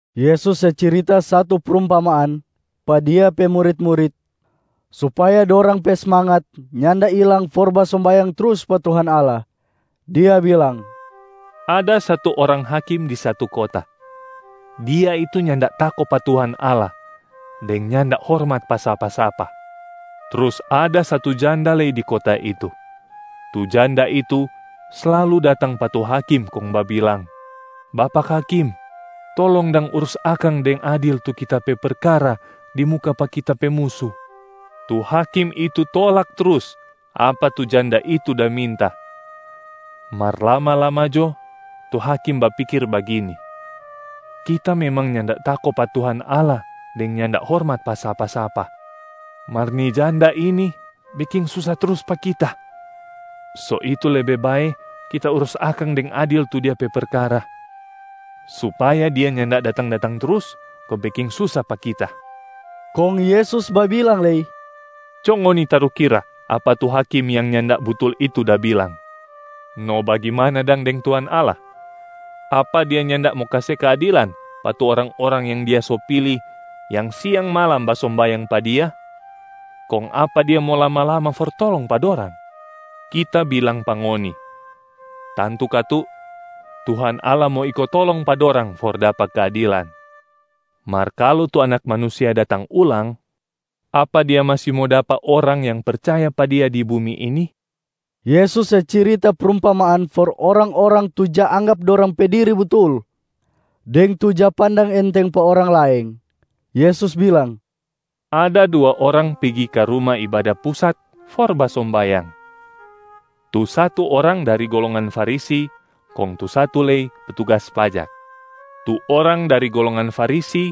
Yesus se cirita satu prumpamaan pa Dia pe murit-murit supaya dorang pe smangat nyanda ilang for basombayang trus pa Tuhan Allah. Dia bilang, “Ada satu orang hakim di satu kota, dia itu nyanda tako pa Tuhan Allah deng nyanda hormat pa sapa-sapa. Trus ada satu janda lei di kota itu. Tu janda itu slalu datang pa tu hakim kong babilang, ‘Bapak hakim, tolong dang urus akang deng adil tu kita pe perkara di muka pa kita pe musu.’ Tu hakim itu tolak trus apa tu janda itu da minta, mar lama-lama jo tu hakim bapikir bagini, ‘Kita memang nyanda tako pa Tuhan Allah deng nyanda hormat pa sapa-sapa. Mar ni janda ini beking susa trus pa kita, so itu lebe bae kita urus akang deng adil tu dia pe perkara supaya dia nyanda datang-datang trus kong beking susa pa kita.’” Kong Yesus babilang lei, “Co ngoni tarukira apa tu hakim yang nyanda butul itu da bilang. No bagimana dang deng Tuhan Allah, apa Dia nyanda mo kase keadilan pa tu orang-orang yang Dia so pili, yang siang malam basombayang pa Dia? Kong apa Dia mo lama-lama for tolong pa dorang? Kita bilang pa ngoni, tantu katu Tuhan Allah mo iko tolong pa dorang for dapa keadilan. Mar kalu tu Anak Manusia datang ulang, apa Dia masi mo dapa orang yang percaya pa Dia di bumi ini?” Yesus se cirita prumpamaan for orang-orang tu ja anggap dorang pe diri butul deng tu ja pandang enteng pa orang laeng. Yesus bilang, “Ada dua orang pigi ka Ruma Ibada Pusat for basombayang. Tu satu orang dari golongan Farisi kong tu satu lei petugas pajak. Tu orang dari golongan Farisi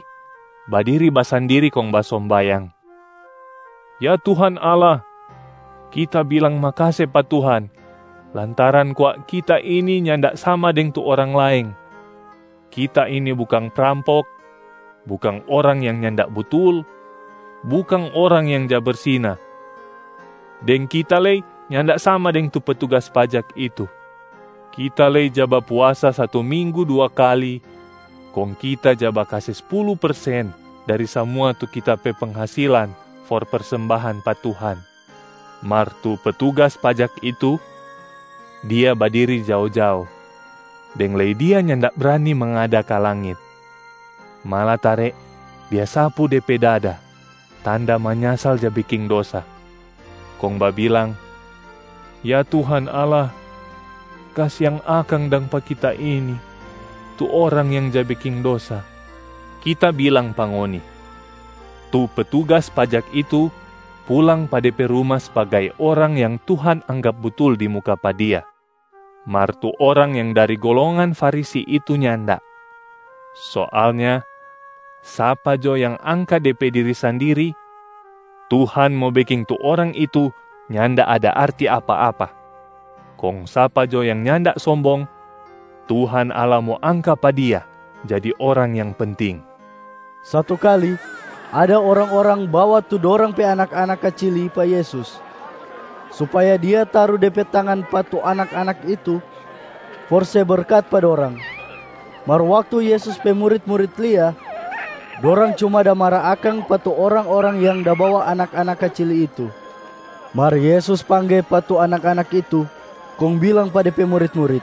badiri basandiri kong basombayang, ‘Ya Tuhan Allah, kita bilang makase pa Tuhan lantaran kwa kita ini nyanda sama deng tu orang laeng. Kita ini bukang prampok, bukang orang yang nyanda butul, bukang orang yang ja bersina, deng kita lei nyanda sama deng tu petugas pajak itu. Kita lei ja bapuasa satu minggu dua kali, kong kita ja bakase spulu persen dari samua tu kita pe penghasilan for persembahan pa Tuhan.’ Mar tu petugas pajak itu, dia badiri jao-jao, deng lei dia nyanda brani mangada ka langit. Malatare dia sapu de pe dada tanda manyasal ja beking dosa, kong babilang, ‘Ya Tuhan Allah, kasiang akang dang pa kita ini tu orang yang ja beking dosa.’ Kita bilang pa ngoni, tu petugas pajak itu pulang pa de pe ruma sbagai orang yang Tuhan anggap butul di muka pa Dia, mar tu orang yang dari golongan Farisi itu nyanda. Soalnya sapa jo yang angka de pe diri sandiri, Tuhan mo beking tu orang itu nyanda ada arti apa-apa. Kong sapa jo yang nyanda sombong, Tuhan Allah mo angka pa dia jadi orang yang penting.” Satu kali ada orang-orang bawa tu dorang pe anak-anak kacili pa Yesus supaya Dia taru De pe tangan pa tu anak-anak itu for se berkat pa dorang. Mar waktu Yesus pe murit-murit lia, dorang cuma da mara akang pa tu orang-orang yang da bawa anak-anak kacili itu. Mar Yesus pangge pa tu anak-anak itu kong bilang pa De pe murit-murit,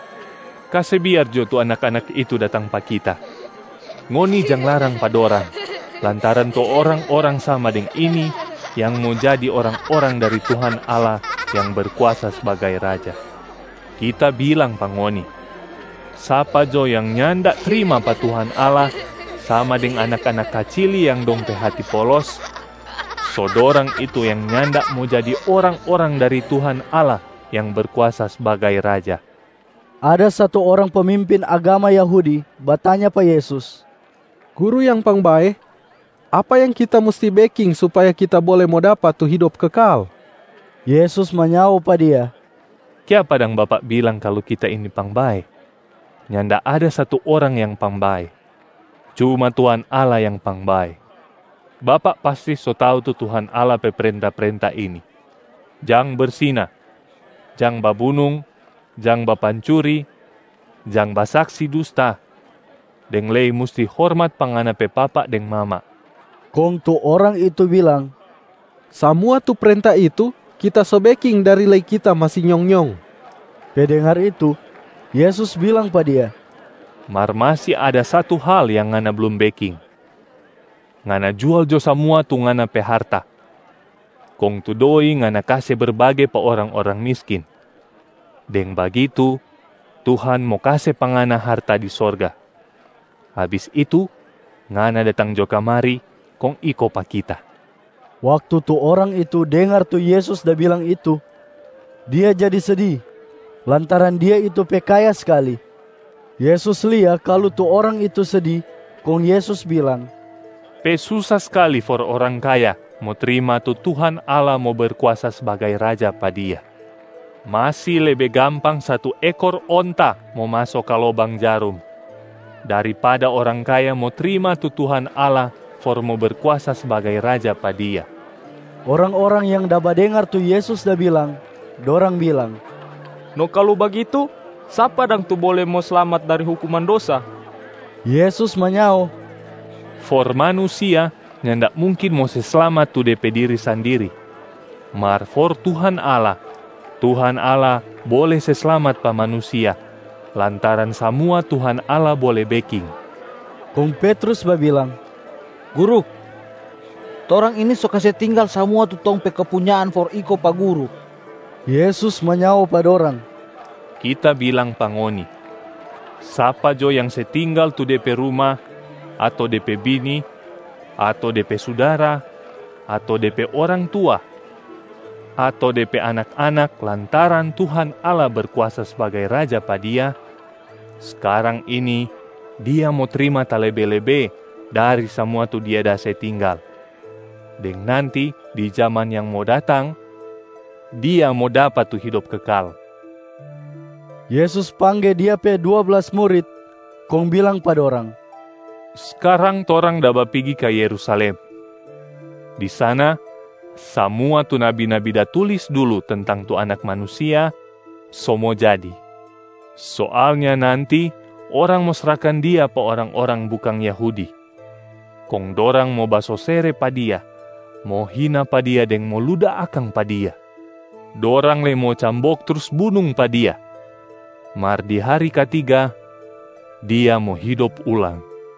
“Kase biar jo tu anak-anak itu datang pa Kita! Ngoni jang larang pa dorang lantaran tu orang-orang sama deng ini yang mo jadi orang-orang dari Tuhan Allah yang Berkuasa sbagai Raja. Kita bilang pa ngoni, sapa jo yang nyanda trima pa Tuhan Allah sama deng anak-anak kacili yang dong pe hati polos, so dorang itu yang nyanda mo jadi orang-orang dari Tuhan Allah yang Berkuasa sbagai Raja.” Ada satu orang pemimpin agama Yahudi batanya pa Yesus, “Guru yang pangbae, apa yang kita musti beking supaya kita bole mo dapa tu hidop kekal?” Yesus manyao pa dia, “Kiapa dang bapak bilang kalu Kita ini pangbae? Nyanda ada satu orang yang pangbae, cuma Tuhan Allah yang pangbae. Bapak pasti so tau tu Tuhan Allah pe prenta-prenta ini: jang bersina, jang babunung, jang bapancuri, jang basaksi dusta, deng lei musti hormat pa ngana pe papa deng mama.” Kong tu orang itu bilang, “Samua tu prenta itu kita so beking dari lei kita masi nyong-nyong.” Pe dengar itu, Yesus bilang pa dia, “Mar masi ada satu hal yang ngana blum beking. Ngana jual jo samua tu ngana pe harta, kong tu doi ngana kase berbage pa orang-orang miskin. Deng bagitu Tuhan mo kase pa ngana harta di sorga. Abis itu ngana datang jo kamari kong iko pa Kita.” Waktu tu orang itu dengar tu Yesus da bilang itu, dia jadi sedi lantaran dia itu pe kaya skali. Yesus lia kalu tu orang itu sedi, kong Yesus bilang, “Pe susa skali for orang kaya mo trima tu Tuhan Allah mo Berkuasa sbagai Raja pa dia. Masi lebe gampang satu ekor onta mo maso ka lobang jarum, daripada orang kaya mo trima tu Tuhan Allah for mo Berkuasa sbagai Raja pa dia.” Orang-orang yang da badengar tu Yesus da bilang, dorang bilang, “No kalu bagitu, sapa dang tu bole mo slamat dari hukuman dosa?” Yesus manyao, “For manusia nyanda mungkin mo se slamat tu de pe diri sandiri, mar for Tuhan Allah, Tuhan Allah bole se slamat pa manusia lantaran samua Tuhan Allah bole beking.” Kong Petrus babilang, “Guru, torang ini so kase tinggal samua tu tong pe kepunyaan for iko pa Guru.” Yesus manyao pa dorang, “Kita bilang pa ngoni, sapa jo yang se tinggal tu de pe ruma, ato de pe bini, ato de pe sudara, ato de pe orang tua ato de pe anak-anak lantaran Tuhan Allah Berkuasa sbagai Raja pa dia, skarang ini dia mo trima talebe-lebe dari samua tu dia da se tinggal, deng nanti di jaman yang mo datang, dia mo dapa tu hidop kekal.” Yesus pangge Dia pe dua blas murit, kong bilang pa dorang, “Skarang torang da bapigi ka Yerusalem. Di sana, samua tu nabi-nabi da tulis dulu tentang tu Anak Manusia so mo jadi. Soalnya nanti orang mo srahkan Dia pa orang-orang bukang Yahudi. Kong dorang mo basosere pa Dia, mo hina pa Dia deng mo luda akang pa Dia. Dorang lei mo cambok trus bunung pa Dia. Mar di hari katiga, Dia mo hidop ulang.”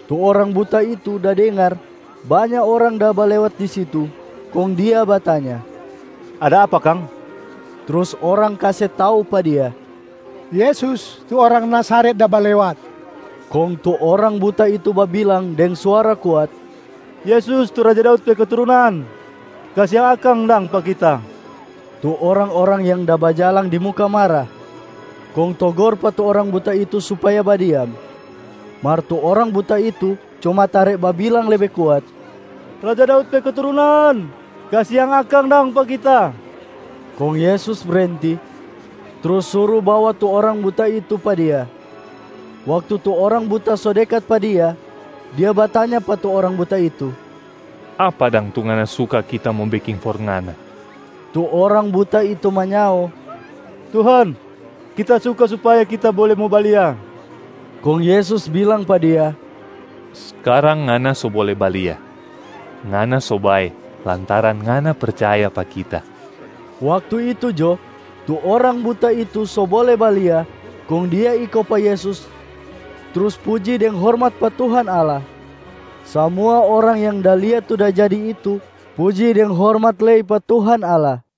Tu orang buta itu da dengar banya orang da balewat di situ, kong dia batanya, “Ada apa kang?” Trus orang kase tau pa dia, “Yesus, tu orang Nazaret da balewat.” Kong tu orang buta itu babilang deng suara kuat, “Yesus tu raja Daud pe keturunan, kasiang akang dang pa kita!” Tu orang-orang yang da bajalang di muka mara, kong togor pa tu orang buta itu supaya badiam. Mar tu orang buta itu cuma tare babilang lebe kuat, “Raja Daud pe keturunan, kasiang akang dang pa kita!” Kong Yesus brenti, trus suru bawa tu orang buta itu pa Dia. Waktu tu orang buta so dekat pa Dia, Dia batanya pa tu orang buta itu, “Apa dang tu ngana suka Kita mo beking for ngana?” Tu orang buta itu manyao, “Tuhan, kita suka supaya kita bole mo balia!” Kong Yesus bilang pa dia, “Skarang ngana so bole balia, ngana so bae lantaran ngana percaya pa Kita.” Waktu itu jo, tu orang buta itu so bole balia kong dia iko pa Yesus trus puji deng hormat pa Tuhan Allah. Samua orang yang da lia tu da jadi itu puji deng hormat lei pa Tuhan Allah.